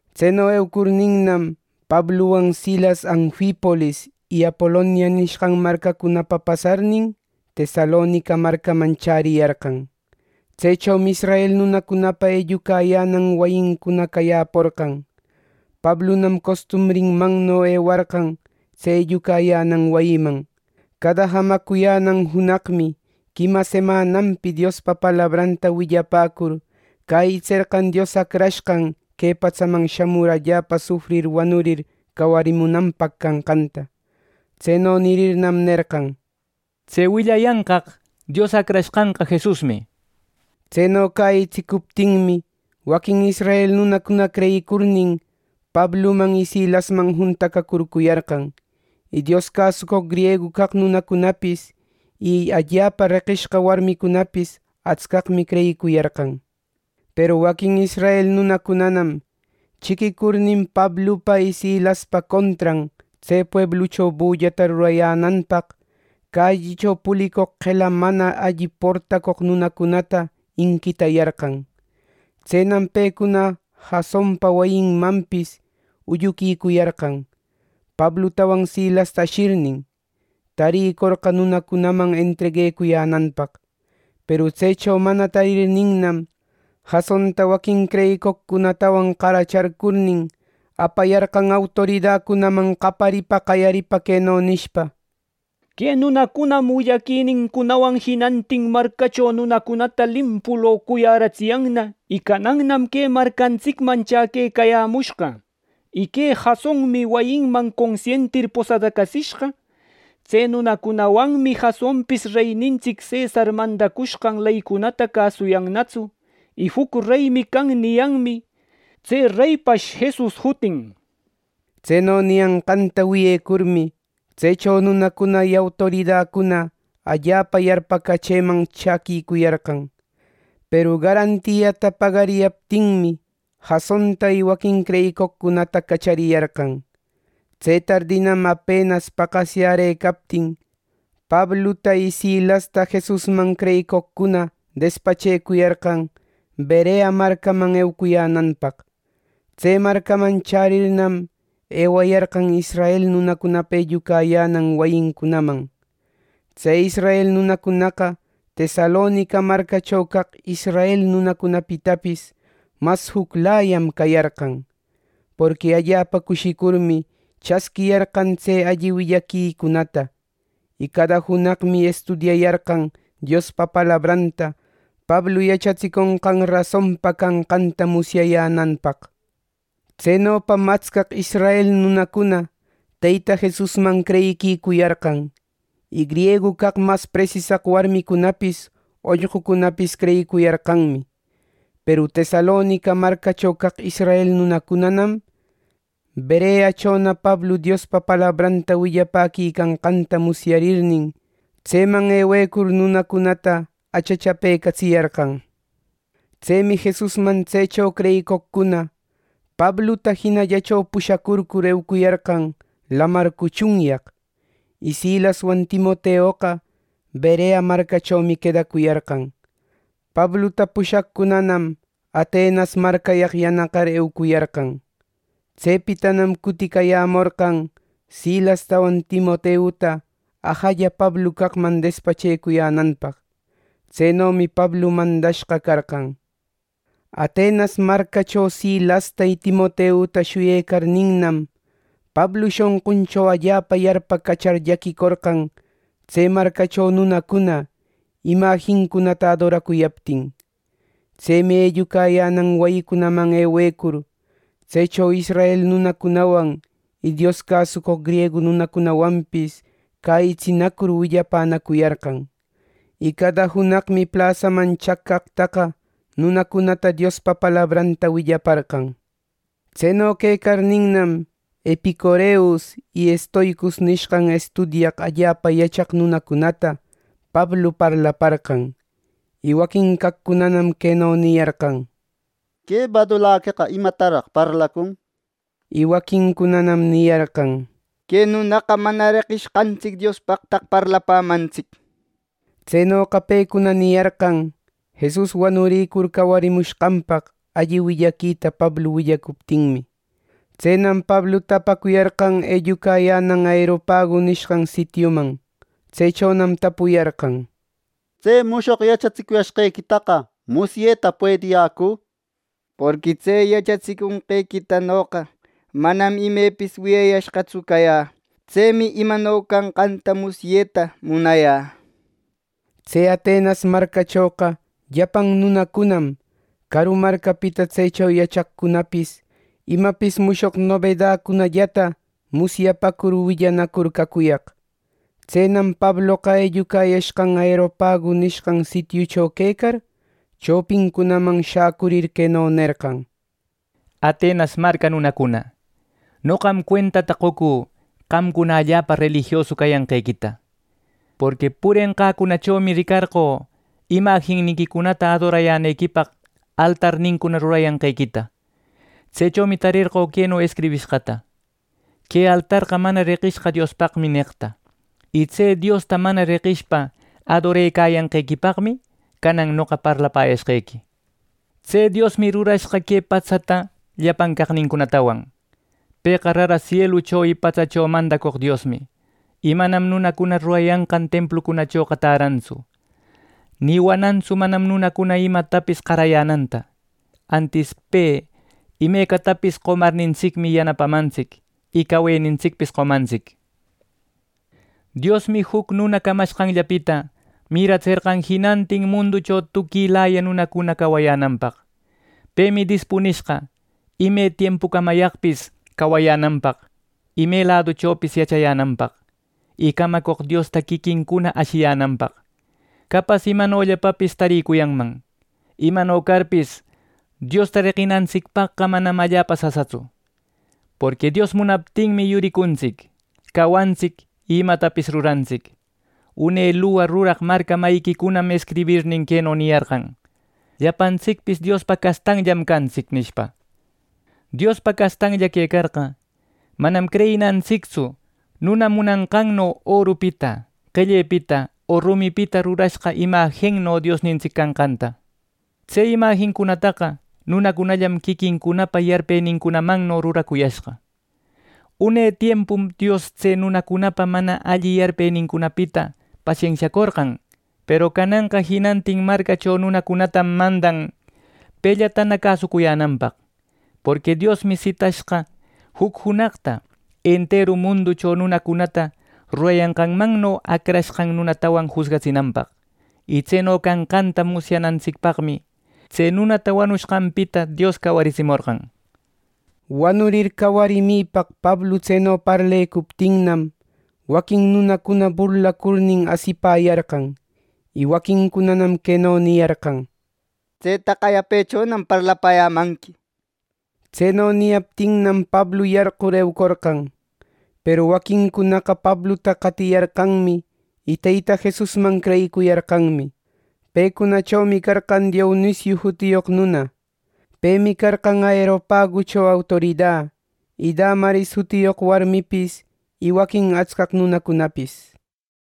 Tseno eucurninnam, Pabluwan Silas Anfipolis y Apolonia nishqan marcacunapa pasarnin, Tesalonica marcaman chäriyarqan. Tsechomi israel nunacunapa ellucayänan wayincuna cayäporqan. Pablunam costumbrinmanno ewarqan tse ellucayänan wayiman. Cada jamacuyänan junaqmi quima semananpi Diospa palabranta willapäcur, cäyitserqan Dios Acrashqan que patsaman shamur allapa sufrir wanurir cawarimunanpaq canqanta. Tseno nirirnam nerqan: —Tse willayanqaq Dios Acrashqanqa Jesusmi —nir. Tseno cäyitsicuptinmi waquin israel nunacuna creyicurnin Pabluman y Silasman juntacacurcuyarqan. Y Dios cäsucoq griegu caq nunacunapis y allapa reqishqa warmicunapis atscaqmi creyicuyarqan. Peru waquin israel nunacunanam chiquicurnin Pablupa y Silaspa contran tse pueblucho bullata rurayänanpaq, callicho pulicoq qela mana alli portacoq nunacunata inquitayarqan. Tsenam pecuna Jasonpa wayinmanpis ulluquicuyarqan, Pablutawan Silasta ashirnin, tarïcorqa nunacunaman entreguecuyänanpaq. Peru tsecho mana tarirninnam, Jasonta waquin creyicoqcunatawan qaracharcurnin, apayarqan autoridacunaman qaparipa qayaripa queno nishpa: —Que nunacunam willaquinincunawan jinantin marcacho nunacunata limpu locuyäratsiyanna y canannam que marcantsicmanna chäquecayämushqa. Y que Jasonmi wayinman consientir posadacatsishqa. Tse nunacunawanmi Jasonpis reynintsic cesar mandacushqan leycunata cäsuyannatsu, y ‘juc reymi can’ niyanmi. Tse reypash Jesus jutin. Tseno niyanqanta wiyecurmi tsecho nunacuna y autoridacuna allapa yarpacachëman chäquicuyarqan. Peru garantiata pagariyaptinmi, Jasonta y waquin creyicoqcunata cachariyarqan. Tse tardinam apenas paqasyärëcaptin Pabluta y Silasta Jesusman creyicoqcuna despachecuyarqan Berea marcaman eucuyänanpaq. Tse marcaman chärirnam ewayarqan israel nunacunapa ellucayänan wayincunaman. Tse israel nunacunaqa Tesalonica marcacho caq israel nunacunapitapis mas juclayam cayarqan. Porqui allapa cushicurmi chasquiyarqan tse alli willaquicunata. Y cada junaqmi estudiayarqan Diospa palabranta Pablu yachatsiconqan rasonpa canqanta musyayänanpaq. Tsenopam atscaq israel nunacuna Teyta Jesusman creyicuyarqan, y griegu caq mas presisaq warmicunapis ollqucunapis creyicuyarqanmi. Peru Tesalonica marcacho caq israel nunacunanam Bereachona Pablu Diospa palabranta willapäquicanqanta musyarirnin, tseman ewecur nunacunata achachapecatsiyarqan. Tsemi Jesusman tsecho creyicoqcuna Pabluta jinallacho pushacurcur eucuyarqan lamar cuchunyaq, y Silaswan Timoteoqa Berea marcachomi quedacuyarqan. Pabluta pushaqcunanam Atenas marcayaq yanaqar eucuyarqan. Tsepitanam cuticayämorqan Silastawan Timoteuta ajalla Pablu caqman despachecuyänanpaq. Tsenomi Pablu mandashqa carqan. Atenas marcacho Silasta y Timoteuta shuyecarninnam Pablu shonquncho allapa yarpacachar llaquicorqan tse marcacho nunacuna imajincunata adoracuyaptin. Tsemi ellucayänan wayicunaman ewecur, tsecho israel nunacunawan y Dios cäsucoq griegu nunacunawanpis cäyitsinacur willapänacuyarqan. Y cada junaqmi plasaman chaq caqtaqa nunacunata Diospa palabranta willaparqan. Tseno quecarninnam Epicureus y Estoicos nishqan estudiaq allapa yachaq nunacunata Pablu parlaparqan. Y waquin caqcunanam queno niyarqan: —Que badulaqueqa ¿imataraq parlacun? —nir. Y waquincunanam niyarqan: —Que nunaqa mana reqishqantsic diospaqtaq parlapämantsic —nishpa. Tsenoqa pecuna niyarqan Jesus wanurïcur cawarimushqanpaq alli willaquita Pablu willapäcuptinmi. Tsenam Pabluta apacuyarqan ellucayänan Aeropagu nishqan sitiuman. Tsechonam tapuyarqan: —¿Tse mushoq yachatsicuyashqequita musyeta puediyäcü? Porqui tse yachatsicushqequitanoqa manam imepis wiyayashqatsu cayä. Tsemi imano canqanta musyeta munayä —nir. Tse Atenas marcachoqa llapan nunacunam, caru marcapita tsecho yachaqcunapis imapis mushoq nobedäcunallata musyapacur willanacur cacuyaq. Tsenam Pabloqa ellucayashqan Aeropagu nishqan sitiucho quecar, chopincunaman shäcurir queno nerqan: “Atenas marca nunacuna, noqam cuentata qocü qamcuna allapa relijiosu cayanqequita. Porqui purenqäcunachomi ricarqö, imajinniquicunata adorayänequipaq altarnincuna rurayanqequita. Tsechomi tarerqö queno escribirëcaqta: ‘Que altarqa mana reqishqa Diospaqmi’ neqta. Y tse Diosta mana reqishpa adorecayanqequipaqmi canan noqa parlapäyäshqequi. “Tse Diosmi rurashqa que patsata llapan caqnincunatawan. Pëqa rara sielucho y patsacho mandacoq Diosmi. Y manam nunacuna rurayanqan templuchoqa tärantsu. Ni wanantsu manam nunacuna imatapis qarayänanta; antis pe imecatapis qomarnintsicmi yanapamantsic y cawenintsicpis qomantsic. “Diosmi juc nuna camanqanllapita miratserqan jinantin munducho tuquilaya nunacuna cawayänanpaq. Pemi dispunishqa ime tiempucamayaqpis cawayänanpaq y me laduchopis yachayänanpaq, y camacoq Diosta quiquincuna ashiyänanpaq. Capas imanollapapis taricuyanman. Imano carpis, Diosta reqinantsicpaqqa manam allapa sasatsu. Porqui Dios munaptinmi, yuricuntsic, cawantsic y imatapis rurantsic. Une luwa ruraq marca mayiquicunam escribirnin queno niyarqan: ‘Llapantsicpis Diospa castanllam cantsic’ nishpa. Diospa castanlla quecarqa, manam creyinantsictsu nuna munanqanno orupita qellepita o rumipita rurashqa imajinno Diosnintsic canqanta. Tse imajincunataqa nunacunallam quiquincunapa yarpenincunamanno ruracuyashqa. Une tiempum Dios tse nunacunapa mana alli yarpenincunapita pasensiacorqan; peru cananqa jinantin marcacho nunacunatam mandan pellatana cäsucuyänanpaq. Porqui Diosmi sitashqa juc junaqta, enteru munducho nunacunata rurayanqanmanno acrashqan nunatawan jusgatsinanpaq. Y tseno canqanta musyanantsicpaqmi tse nunata wanushqanpita Dios cawariratsimorqan.” Wanurir cawarimipaq Pablu tseno parlecuptinnam, waquin nunacuna burlacurnin asipäyarqan. Y waquincunanam queno niyarqan: —Tsetaqa yapechonam parlapäyänanqui —nishpa. Tseno niyaptinnam Pablu yarqur eucorqan. Peru waquincunaqa Pabluta qatiyarqanmi y Teyta Jesusman creyicuyarqanmi. Pecunachomi carqan Dionisiu jutiyoq nuna. Pemi carqan Areopagucho autorida. Y Damaris jutiyoq warmipis y waquin atscaq nunacunapis.